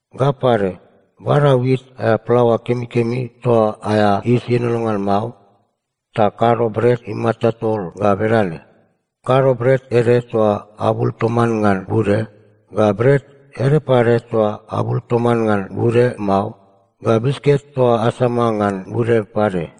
Ga pade, bada wit aea plaoa kemikemi toa aea yis ienono ngan mao, ta kado bret imata tol ga bedane: Kado bret ede toa abul toman ngan bude, ga bret ede pade toa abul toman ngan bude mao, ga bisket toa asama ngan bude pade.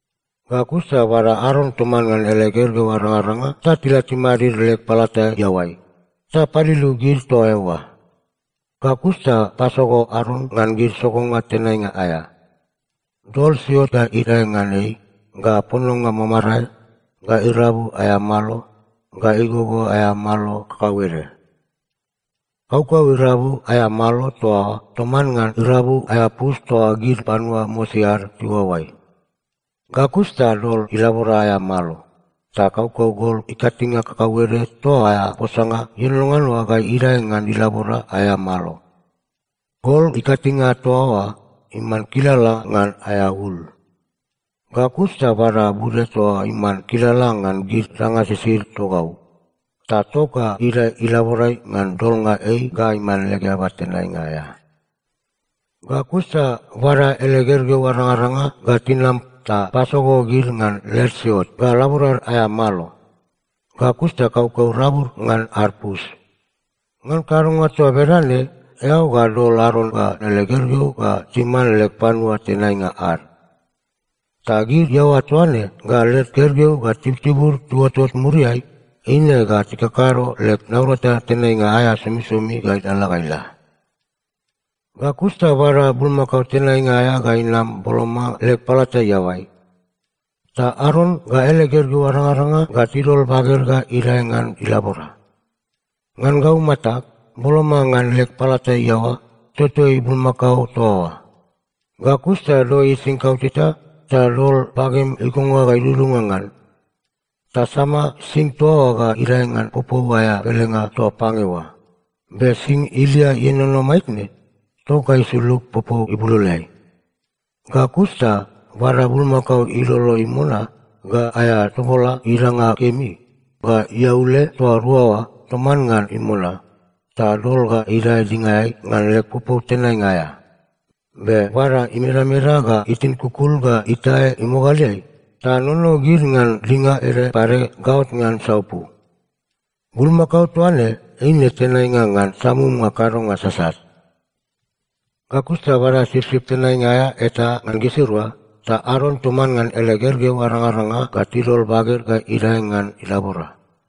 “Ga kus ta bada Aron toman ngan ele gergeu arangaranga ta tila timadid leg palata iaoai, ta paliliu gid toa eoa. Ga kus ta pasogo Aron ngan gid sogonga tenainga aea. Dol siot ga idae ngan ei, ga pononga mamarae, ga irabu aea malo, ga igogo aea malo kakauede. Kaukau irabu aea malo toa oa toman ngan irabu aea pus toa gid panua mosi ad tiuaoai. Ga kus ta dol ilabora aea malo, ta kaukau gol ikatinge kakauede toa aea posanga ienono ngan oa ga idae ngan ilabora aea malo. Gol ikatinge toa oa iman kilala ngan aea ul. Ga kus ta bada bude toa iman kilala ngan gid danga sisid togau, ta tok ga idae ilaborai ngan dolnga ei ga iman leg eaba tenainga aea. “Ga kus ta bada ele gergeu arangaranga ga tinam ta pasogo gid ngan led siot ga laborad aea malo. Ga kus ta kaukau rabud ngan ad pus. Ngan kadonga toa bedane eao ga dol Aron ga ele gergeu ga timan leg panua tenainga ad. Ta gid iaoa toaine ga led gergeu ga tibutibud tiuotot muriai, eine ga tikakado leg naurata tenainga aea somisomi ga ilalala ga ila. “Ga kus ta bada bulmakao tenainga aea ga inam boloma leg palata iaoai. Ta Aron ga ele gergeu arangaranga ga tidol baged ga idae ngan ilabora. Ngan gau matag, boloma ngan leg palata iaoa, totoi bulmakao toa oa. Ga kus ta doi ising kauteta, ta dol bagem igonga ga idudunga ngan, ta sama sing toa oa ga idae ngan popou aea pelenga toa pange oa. Be sing ilia ienono maitne, tok ga isulug popou ibuloloeai. Ga kus ta bada bulmakao ilolo imona, ga aea toboloa idanga kemi, ga iaule toa rua oa toman ngan imona, ta dol ga idae dingaeai ngan leg popou tenainga aea. Be bada imedameda ga itin kukul ga itae imogaleai, ta nono gid ngan dinga ede pade gaot ngan saupu. Bulmakao toa ne eine tenainga ngan samumnga kadonga sasat. “Ga kus ta bada sipsip tenainga aea eta ngan gisirua, ta Aron toman ngan ele gergeu arangaranga ga tidol baged ga idae ngan ilabora.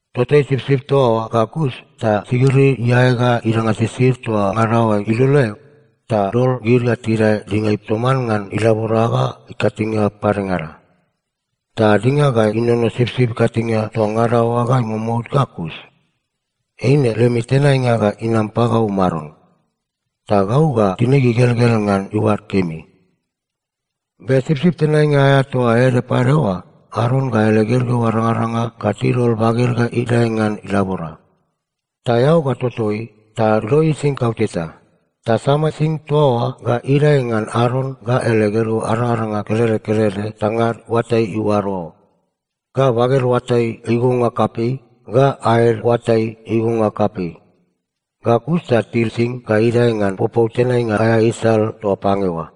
Totoi sipsip toa oa ga kus, ta sigiri iae ga idanga sisid toa ngada oa iloleai, ta dol gid ga tidae dingaeai toman ngan ilabora ga ikatinge padengada. Ta dinga ga inono sipsip ikatinge toa ngada oa ga imomout ga kus. Eine lemi tenainga ga inam pagau Maron. Ta gau ga tinig igelgel ngan iuad kemi. “Be sipsip tenainga aea toa ede pade oa, Aron ga ele gergeu arangaranga ga tidol baged ga idae ngan ilabora. Ta eao ga totoi, ta doi ising kauteta. Ta sama sing toa oa ga idae ngan Aron ga ele gergeu arangaranga kelede kelede tangad oatai iuaro, ga baged oatai igonga kapei, ga aed oatai igonga kapei. Ga kus ta til sing ga idae ngan popou tenainga aea isal toa pange oa.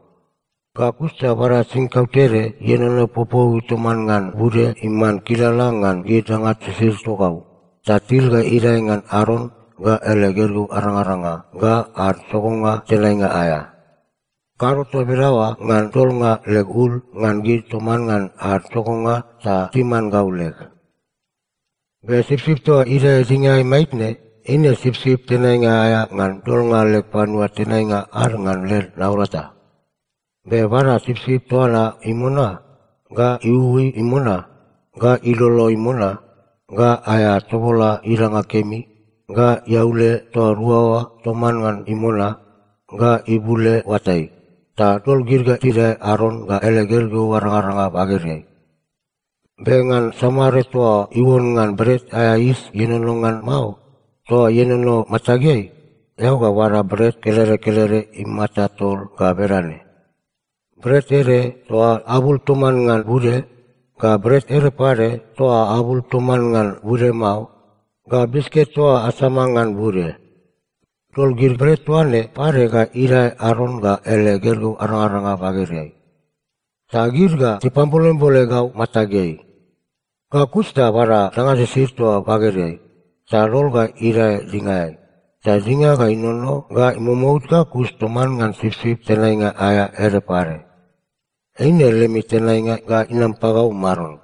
Ga kus ta bada sing kautede ienono popouiai toman ngan bude iman kilala ngan gid danga sisid togau, ta til ga idae ngan Aron, ga ele gergeu arangaranga, ga ad sogonga tenainga aea. Kado toa bedaoa ngan dolnga leg ul ngan gid toman ngan ad sogonga ta timan gau leg. “Be sipsip toa idae dingaeai maitne, eine sipsip tenainga aea ngan dolnga leg panua tenainga ad ngan led naurata. Be bada sipsip toa na imona, ga iuui imona, ga ilolo imona, ga aea toboloa idanga kemi, ga iaule toa rua oa toman ngan imona, ga ibule oatai, ta dol gid ga tidae Aron ga ele gergeu arangaranga bagedai. Be ngan samare toa iuon ngan bret aea yis ienono ngan mao, toa ienono matageai, eao ga bada bret kelede kelede imata tol ga bedane: bret ede toa abul toman ngan bude, ga bret ede pade toa abul toman ngan bude mao, ga bisket toa asama ngan bude. Dol gid bret toa ne pade ga idae Aron ga ele gergeu arangaranga bagedeai. Ta gid ga tipatambolembole gau matageai. Ga kus ta bada danga sisid toa bagedeai, ta dol ga idae dingaeai, ta dinga ga inono ga imomout ga kus toman ngan sipsip tenainga aea ede pade. Eine lemi tenainga ga inam pagau Maron.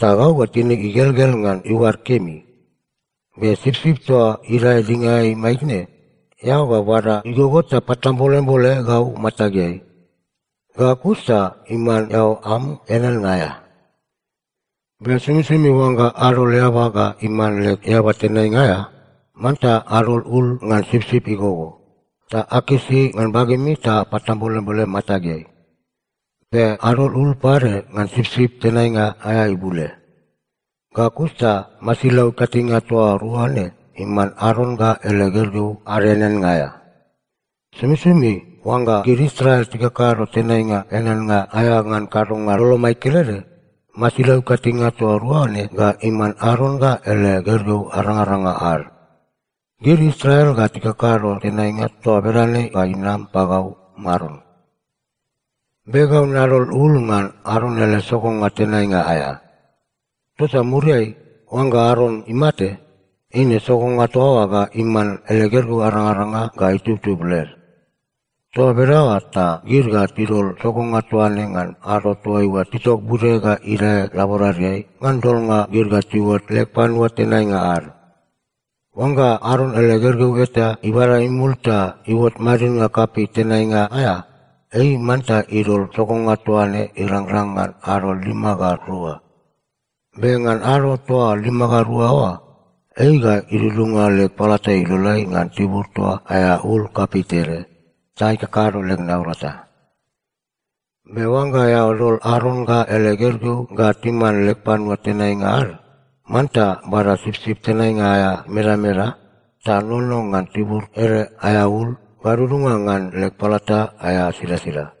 Ta gau ga tinig igelgel ngan iuad kemi. Be sipsip toa idae dingaeai maitne, eao ga bada igogo ta patambolembole gau matageai. Ga kus ta iman eao am eaneannga aea. “Be somisomi oangga adol eaba ga iman leg eaba tenainga aea, manta adol ul ngan sipsip igogo, ta akisi ngan bagemi, ta apatambolembole matageai. Be adol ul pade ngan sipsip tenainga aea ibule. Ga kus ta masilau ikatinge toa rua ne iman Aron ga ele gergeu ad eaneannga aea. Somisomi oangga gid Israel tikakado tenainga eaneannga aea ngan kadonga lolomai kelede, masilau ikatinge toa rua ne ga iman Aron ga ele gergeu arangaranga ad. Gid Israel ga tikakado tenainga toa bedane ga inam pagau Maron. “Be gau nadol ul ngan Aron ele sogonga tenainga aea. Tota muriai, oangga Aron imate, eine sogonga toa oa ga iman ele gergeu arangaranga ga itubtub led. Toa bedaoa ta gid ga tidol sogonga toa ne ngan ado toaiua titok bude ga idae laboradeai ngan dolnga gid ga tiuot leg panua tenainga ad. Oangga Aron ele gergeu eta ibada imul ta iuot madidnga kapei tenainga aea, ei manta idol sogonga toa ne irangrang ngan ado lima ga rua. Be ngan ado toa lima ga rua oa, ei ga idudunga leg palata iloleai ngan tibur toa aea ul kapei tede, ta ikakado leg naurata. “Be oangga eao dol Aron ga ele gergeu ga timan leg panua tenainga ad, manta bada sipsip tenainga aea imedameda, ta nono ngan tibur ede aea ul, gadudunga ngan leg palata aea silasila.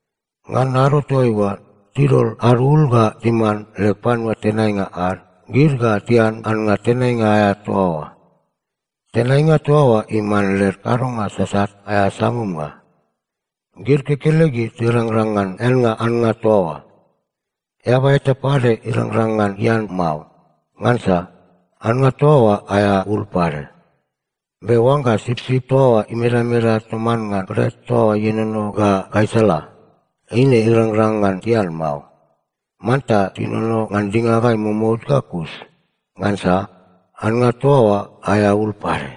Ngan ado toaiua tidol ad ul ga timan leg panua tenainga ad, gid ga tian annga tenainga aea toa oa. Tenainga toa oa iman led kadonga sasat aea samumnga. Gid kekelegid tirangrang ngan eannga annga toa oa. Eaba eta pade irangrang ngan ian mao, ngansa annga toa oa aea ul pade. Be oangga sipsip toa oa imedameda toman ngan bret toa oa ienono ga gaisala, eine irangrang ngan tian mao. Manta tinono ngan dinga ga imomout ga kus, ngansa annga toa oa aea ul pade.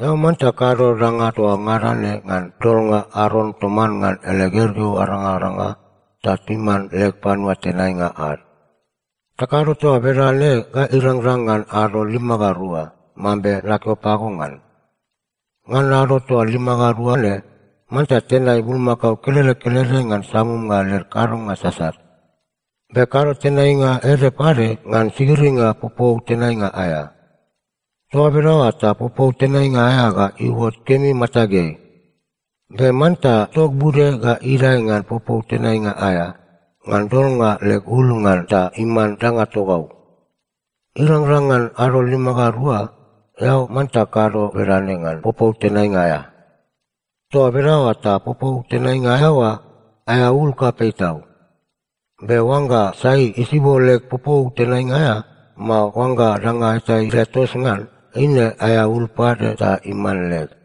“Eao manta kado danga toa ngada ne ngan dolnga Aron toman ngan ele gergeu arangaranga ta timan leg panua tenainga ad. Ta kado toa bedane ga irangrang ngan ado lima ga rua, mambe nakeo pago ngan. Ngan ado toa lima ga rua ne, manta tenai bulmakao kelede kelede ngan samumnga led kadonga sasat. Be kado tenainga ede pade ngan sigiringa popou tenainga aea. Toa bedaoa ta popou tenainga aea ga iuot kemi matageai. Be manta tok bude ga idae ngan popou tenainga aea, ngan dolnga leg ul ngan ta iman danga togau. Irangrang ngan ado lima ga rua, eao manta kado bedane ngan popou tenainga aea. Toa bedaoa ta popou tenainga aea oa, aea ul kapei tau. Be oangga sai isibo leg popou tenainga aea, mao oangga danga eta idae tos ngan, eine aea ul pade ta iman leg.”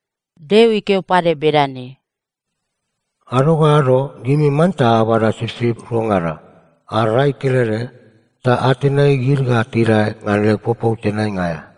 Deo ikeo pade bedane, “Ado ga ado gimi manta abada sipsip ruangada, ad rai kelede, ta atenai gid ga tidae ngan leg popou tenainga aea.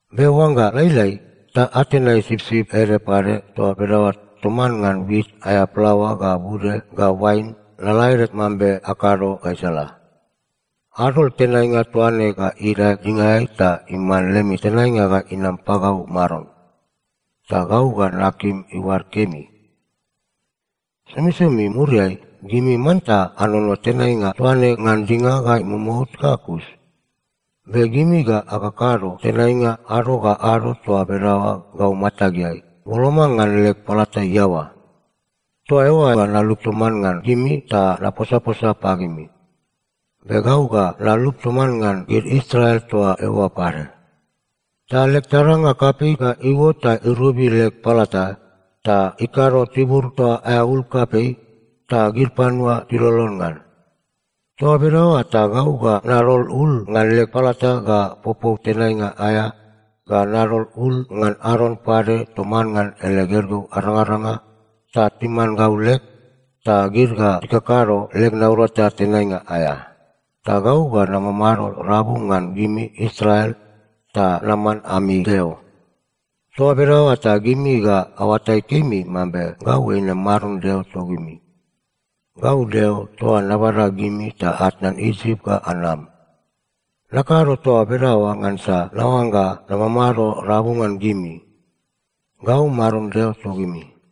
Be oangga lailai, ta atenai sipsip ede pade toa bedaoa toman ngan wit aea plaoa ga bude ga oain lalaede mambe akado gaisala. Adol tenainga toa ne ga idae dingaeai ta iman lemi tenainga ga inam pagau Maron. Ta gau ga nakim iuad kemi. “Somisomi muriai, gimi manta anono tenainga toa ne ngan dinga ga imomout ga kus. Be gimi ga akakado tenainga ado ga ado toa bedaoa gau matageai, boloma ngan leg palata iaoa. Toa eoa ga nalup toman ngan gimi ta naposaposa pagimi. Be gau ga nalup toman ngan gid Israel toa eoa pade. Ta leg taranga kapei ga iuot ta irobi leg palata, ta ikado tibur toa oa aea ul kapei, ta gid panua tilolon ngan. “Toa bedaoa ta gau ga nadol ul ngan leg palata ga popou tenainga aea ga nadol ul ngan Aron pade toman ngan ele gergeu arangaranga ta timan gau leg, ta gid ga tikakado leg naurata tenainga aea. Ta gau ga namamado rabu ngan gimi Israel ta naman ami Deo. Toa bedaoa ta gimi ga aoatai kemi mambe gau eine Maron Deo togimi. Gau Deo toa nabada gimi ta atnan Isip ga anam. Nakado toa bedaoa ngansa naoangga namamado rabu ngan gimi. Gau Maron Deo togimi.”